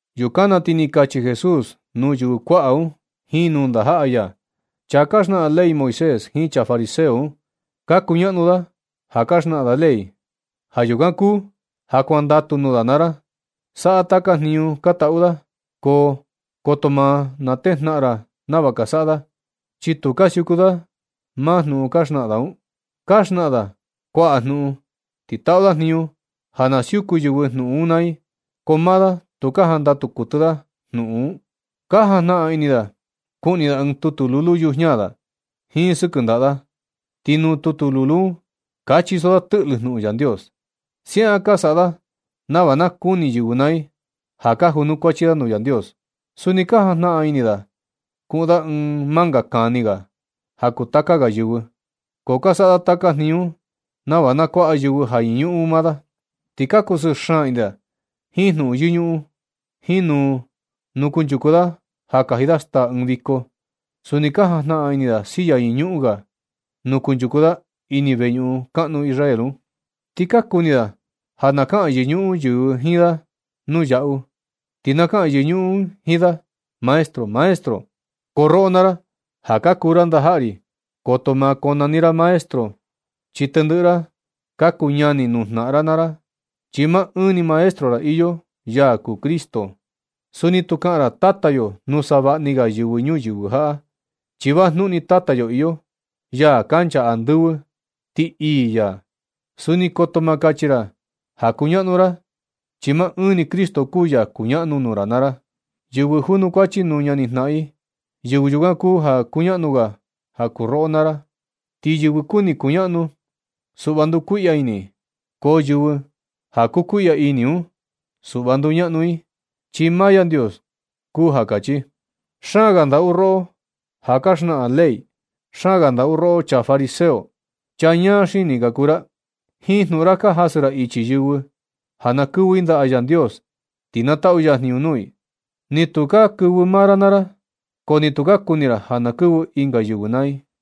Yukan na ti ni kachi Jesús nuu yɨvɨ kuaꞌa un jiin nuu ndajaꞌa ya: ―Chaa ka xnaꞌan ley Moisés jiin chaa fariseo un, ka kuñaꞌnu da ja ka xnaꞌan da ley. Ja yukan kuu ja kuandatu nuu da naa ra, saꞌa taka jniñu ka taꞌu da, ko koto ma natejnaꞌan ra nava ka saꞌa da, chi tu ka siuku da maa jnuꞌun ka xnaꞌan da un. Ka xnaꞌan da kuaꞌa jnuꞌun, ti taꞌu da jniñu ja na siuku yɨvɨ jnuꞌun un naa i, ko maa da tu ka jandatu kuɨtɨ da jnuꞌun un. Ka jajnaꞌan ini da kuꞌni da ɨɨn tutu lulu yujiña da jiin sɨkɨ ndaꞌa da, ti nuu tutu lulu un ka chiso da tɨꞌlɨ jnuꞌun Yandios. Siaꞌan ka saꞌa da nava na kuni yɨvɨ naa i ja ka junukuachi da nuu Yandios. Suni ka jajnaꞌan ini da kuꞌun da ɨɨn manga kani ga ja kuu taka ga yɨvɨ. So ka saꞌa da taka jniñu un nava na kuaꞌa yɨvɨ ja yɨñuꞌun maa da. Ti ka kusɨɨ xaan ini da jiin jnuꞌun yɨñuꞌun jiin nuu nu kunchuku da ja kaji da staa ɨɨn viko. Suni ka jajnaꞌan ini da silla yɨñuꞌun ga nuu kunchuku da ini veñuꞌun kaꞌnu Israel un. Ti ka kuni da ja na kaꞌan yɨñuꞌun yɨvɨ jiin da nuu yaꞌu, ti na kaꞌan yɨñuꞌun i jiin da, “Maestro, maestro.” Ko roꞌo naa ra ja ka kuu ra ndajaꞌa ri, koto ma konani ra “maestro”, chi tendɨꞌɨ ra ka kuu ñani nuu jnaꞌan ra naa ra, chi maa ɨɨn ni Maestro ra iyo, ya kuu Cristo. Suni tu kaꞌan ra “tata yo” nuu savaꞌa ni ga yɨvɨ ñuyɨvɨ jaꞌa, chi vajnuꞌun ni Tata yo iyo, ya kancha andɨvɨ, ti ii ya. Suni koto ma kachi ra ja kuñaꞌnu ra, chi maa ɨɨn ni Cristo kuu ya kuñaꞌnu nuu ra naa ra. Yɨvɨ junukuachi nuu ñanijnaꞌan i, yɨvɨ yukan kuu ja kuñaꞌnu ga ja kuu roꞌo naa ra. Ti yɨvɨ kuni kuñaꞌnu, suꞌva ndukuiꞌya ini i. Ko yɨvɨ ja kukuiꞌya ini un, suꞌva nduñaꞌnu i, chi maa Yandios kuu ja kachi. ¡Xaan ga ndaꞌu roꞌo ja ka xnaꞌan ley! ¡Xaan ga ndaꞌu roꞌo, chaa fariseo! ¡Chaa ñaa xini ka kuu ra! Jiin jnuꞌun ra ka jasɨ ra ichi yɨvɨ ja na kɨvɨ i ndaꞌa Yandios, ti na taꞌu ya jniñu nuu i. Ni tu ka kuni kɨvɨ maa ra naa ra, ko ni tu ka kuni ra ja na kɨvɨ ɨnga yɨvɨ naa i.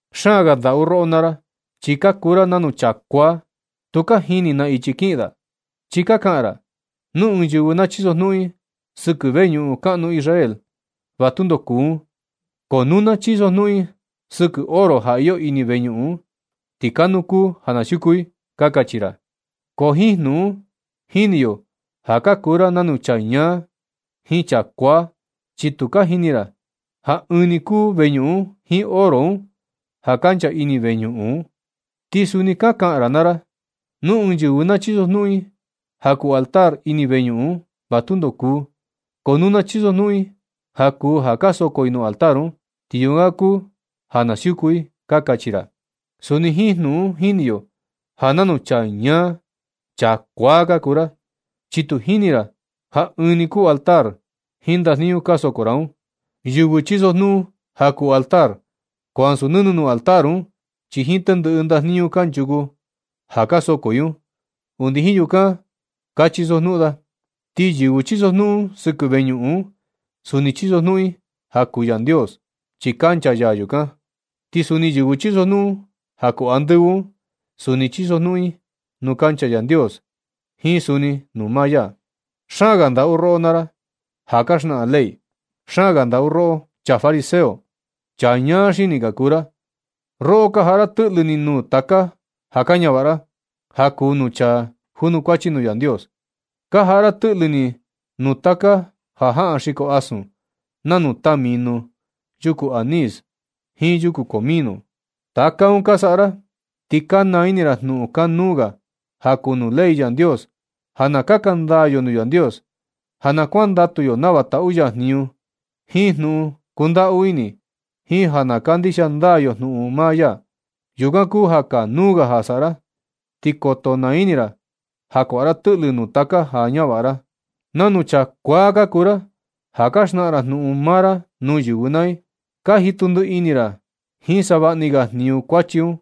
¡Xaan ga ndaꞌu roꞌo naa ra! Chi ka kuu ra nanu chaa kuaa tu ka jini na ichi kiꞌin da, chi ka kaꞌan ra: “Nu ɨɨn yɨvɨ na chisojnuꞌun i sɨkɨ veñuꞌun kaꞌnu Israel, va tundo kuu un. Ko nu na chisojnuꞌun i sɨkɨ oro ja iyo ini veñuꞌun un, ti kanuu kuu ja na siuku i”, ka kachi ra. Ko jiin jnuꞌun un jini yo ja ka kuu ra nanu chaa ñaa jiin chaa kuaa. Chi tu ka jini ra ja ɨɨn ni kuu veñuꞌun jiin oro un ja kancha ini veñuꞌun un. Ti suni ka kaꞌan ra naa ra: “Nu ɨɨn yɨvɨ na chisojnuꞌun i ja kuu altar ini veñuꞌun un, va tundo kuu. Ko nu na chisojnuꞌun i ja kuu ja ka soko i nuu altar un, ti yukan kuu ja na siuku i”, ka kachi ra. Suni jiin jnuꞌun un jini yo ja nanu chaa ñáá, chaa kuáá ka kuu ra, chi tu jini ra ja ɨɨn ni kuu altar un jiin ndajniñu ka soko ra un. Yɨvɨ chisojnuꞌun ja kuu nuu altar, ko ansu nɨnɨ nuu altar un, chi jiin tendɨꞌɨ ndajniñu kanchuku ja ka soko i un, undi jiin yukan ka chisojnuꞌun da. Ti yɨvɨ chisojnuꞌun sɨkɨ veñuꞌun un, suni chiso jnuꞌun i ja kuu Yandios, chi kancha ya yukan. Ti suni yɨvɨ chisojnuꞌun ja kuu andɨvɨ un, suni chisojnuꞌun i nuu kancha Yandios, jiin suni nuu maa ya. ¡Xaan ga ndaꞌu roꞌo naa ra ja ka xnaꞌan ley! ¡Xaan ga ndaꞌu roꞌo, chaa fariseo! Chi chaa ñaa xini ka kuu ra. Roꞌo ka jaꞌa ra tɨꞌlɨ ni nuu taka ja ka ñavaꞌa ra, ja kuu nuu chaa junukuachi nuu Yandios. Ka jaꞌa ra tɨꞌlɨ ni nuu taka jajaꞌan xiko asun, nanu tamino, yuku anís jiin yuku comino. Taka un ka saꞌa ra, ti ka naa ini ra jnuꞌun kanuu ga ja kuu nuu ley Yandios, ja na kaka ndaa yo nuu Yandios, ja na kuandatu yo nava taꞌu ya jniñu jiin jnuꞌun kundaꞌu ini, jiin ja na kandixia ndaa yo jnuꞌun maa ya. Yukan kuu ja kanuu ga ja saꞌa ra, ti koto naa ini ra ja kuaꞌa ra tɨꞌlɨ nuu taka ja kaa ñavaꞌa ra. Nanu chaa kuaa ka kuu ra ja ka xnaꞌan ra jnuꞌun maa ra nuu yɨvɨ naa i. Ka jitu ndiꞌi ini ra jiin savaꞌni ga jniñu kuachi un.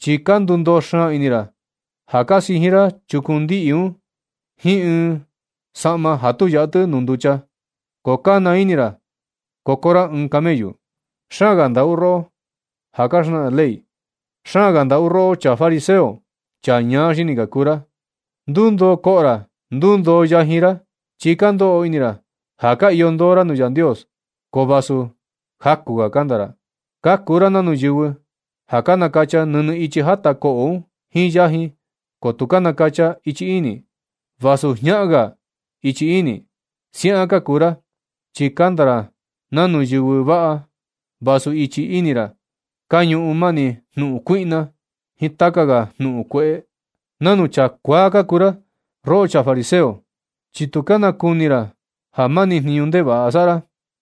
Chi ka ndundoo xaan ini ra ja ka sijin ra chukun ndiꞌi un jiin ɨɨn tela ja tu yaꞌa tɨ nuu nducha. Ko ka naa ini ra koko ra ɨɨn camellu. ¡Xaan ga ndaꞌu roꞌo ja ka xnaꞌan ley! ¡Xaan ga ndaꞌu roꞌo, chaa fariseo! Chaa ñaa xini ka kuu ra. Ndundoo koꞌo ra, ndundoo yajin ra, chi ka ndoꞌo ini ra ja ka iyo ndoo ra nuu Yandios, ko vasu jaku ga kanda ra. Ka kuu ra nanu yɨvɨ ja ka nakacha nɨnɨ ichi jata koꞌo un jiin yajin, ko tu ka nakacha i ichi ini, vasu jñaꞌan ga ichi ini. Siaꞌan ka kuu ra, chi kanda ra nanu yɨvɨ vaꞌa, vasu ichi ini ra ka ñuꞌun mani jnuꞌun kuiꞌna jiin taka ga jnuꞌun kueꞌe. Nanu chaa kuaa ka kuu ra roꞌo chaa fariseo, chi tu ka nakuni ra ja mani jniñu ndevaꞌa saꞌa ra.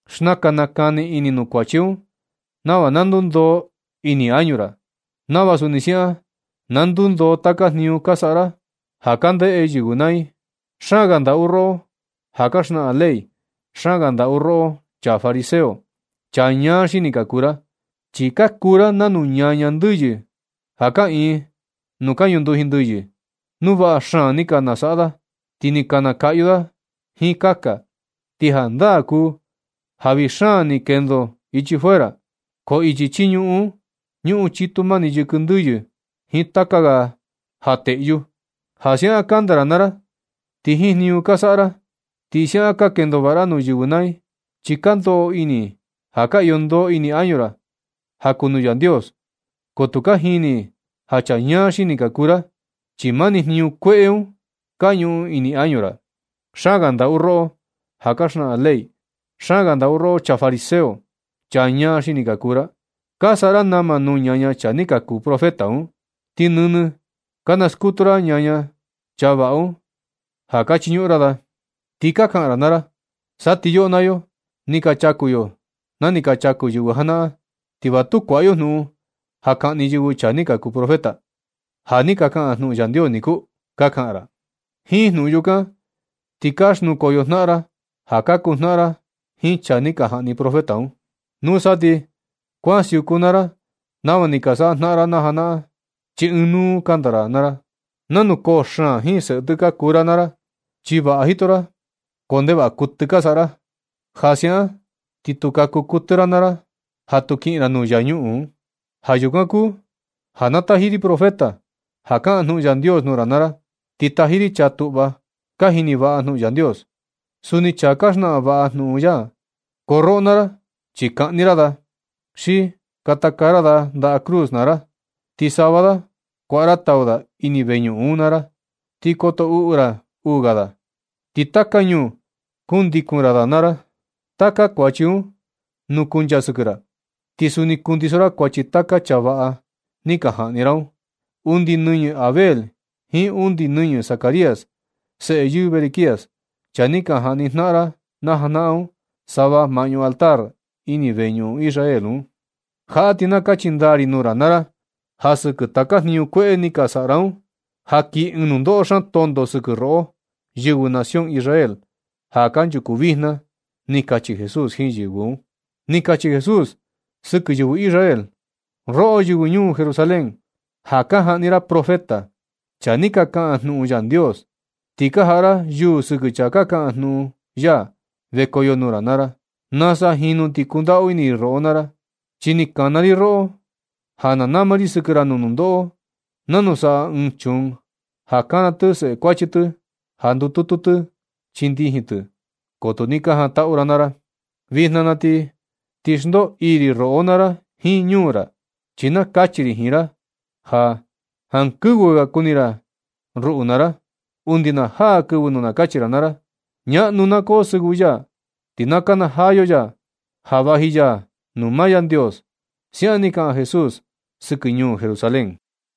Xnakan nakani ini nuu kuachi un nava na ndundoo ini añu ra, nava suni siaꞌan na ndundoo taka jniñu ka saꞌa ra ja ka ndeꞌe yɨvɨ naa i. ¡Xaan ga ndaꞌu roꞌo ja ka xnaꞌan ley! ¡Xaan ga ndaꞌu roꞌo, chaa fariseo! Chaa ñaa xini ka kuu ra, chi ka kuu ra nanu ñaña ndɨyɨ kaꞌiin panteon, nuu vaꞌa xaan ni ka saꞌa da. Ti ni ka nakaꞌyu da jiin kaka, ti jandaa kuu ja vii xaan ni kendo ichi fuera, ko ichi chii ñuꞌun un, ñuꞌun chitu mani yɨkɨ ndɨyɨ jiin taka ga ja teꞌyu. Ti siaꞌan kanda ra naa ra jiin jniñu ka saꞌa ra, ti siaꞌan ka kendo vaꞌa ra nuu yɨvɨ naa i, chi ka ndoꞌo ini i ja ka iyo ndoo ini añu ra ja kuu nuu Yandios. Ko tu ka jini i ja chaa ñaa xini ka kuu ra, chi mani jniñu kueꞌe un ka ñuꞌun ini añu ra. ¡Xaan ga ndaꞌu roꞌo ja ka xnaꞌan ley! ¡Xaan ga ndaꞌu roꞌo, chaa fariseo! Chaa ñaa xini ka kuu ra. Ka saꞌa ra nama nuu ñaña chaa ni ka kuu profeta un, ti nɨnɨ ka naskutu ra ñaña chaa vaꞌa un ja ka chiñuꞌun ra da. Ti ka kaꞌan ra naa ra: “Sa ti yoꞌo naa yo, ni ka chaku yo na ni ka chaku yɨvɨ janaꞌan, ti va tu kuaꞌa yo jnuꞌun ja kaꞌni yɨvɨ chaa ni ka kuu profeta, ja ni kaꞌan jnuꞌun Yandios niku”, ka kaꞌan ra. Jiin jnuꞌun yukan ni, ti ka xnukoyo jnaꞌan ra ja ka kuu jnaꞌan ra jiin chaa ni ka jaꞌni profeta un. Nusa ti kuan siuku naa ra nava ni ka saꞌa jnaꞌan ra janaꞌan, chi ɨɨn nuu kanda ra naa ra. Nanu koo xaan jiin seꞌe tɨ ka kuu roꞌo naa ra. Chi vaꞌa jito ra, ko ndevaꞌa kuɨtɨ ka saꞌa ra. Ja siaꞌan ti tu kaku kuɨtɨ ra naa ra ja tu kiꞌin ra nuu infiernu. Ja yukan kuu ja na taji ri profeta ka kaꞌan jnuꞌun Yandios nuu ra naa ra. Ti taji ri chaa tuꞌva ja ka jini vaꞌa jnuꞌun Yandios, suni chaa ka xnaꞌan vaꞌa jnuꞌun ya. Ko roꞌo naa ra, chi kaꞌni ra da, xi katakaa ra da ndaꞌa cruz naa ra, ti sava da kuaꞌa ra tau da ini veñuꞌun ra naa ra. Ti koto uꞌu ra uu ga da, ti taka ñuu kundikun ra da naa ra. Taka kuachi un nukuncha sɨkɨ ra. Ti suni nukundiso ra kuachi taka chaa vaꞌa ni ka jaꞌni ra un, undi nɨñɨ Abel jiin undi nɨñɨ Zacarías, seꞌe yɨɨ Berequías, chaa ni ka jaꞌni jnaꞌan ra na janaꞌan un, sava maꞌñu altar ini veñuꞌun Israel un. Jaꞌa ti na kachi ndaa ri nuu ra naa ra, ja sɨkɨ taka jniñu kueꞌe ni ka saꞌa ra un, ja kii ɨɨn nundoꞌo xaan tonto sɨkɨ roꞌo, yɨvɨ nación Israel ja kanchuku vijna ―ni kachi Jesús jiin yɨvɨ un. Ni kachi Jesús sɨkɨ yɨvɨ Israel: ―Roꞌo, yɨvɨ ñuu Jerusalén, ja ka jaꞌni ra profeta, chaa ni ka kaꞌan jnuꞌun Yandios, ti ka jaꞌa ra yuu sɨkɨ chaa kaꞌan jnuꞌun ya vekoyo nuu ra naa ra. ¡Nasa jinu ni kundaꞌu ini ri roꞌo naa ra! Chi ni nakana ri roꞌo ja na nama ri sɨkɨ ra nuu nundoꞌo, nanu saꞌa ɨɨn chuun ja nakana tɨ seꞌe kuachi tɨ, ja na ndututu chii ndijin tɨ, ko tu ni ka jantaꞌu ra naa ra. Vijna na ti na xndoo ii ri roꞌo naa ra jiin ñuu ra. Chi na kachi ri jiin ra ja, jankɨvɨ ga kuni ra ruꞌu naa ra, undi na jaa kɨvɨ nu kachi ra naa ra: “Ñaꞌnu na koo sɨvɨ ya, ti na kanajaa yo yaa ja vaji ya nuu maa Yandios” ―siaꞌan ni kaꞌan Jesús sɨkɨ ñuu Jerusalén.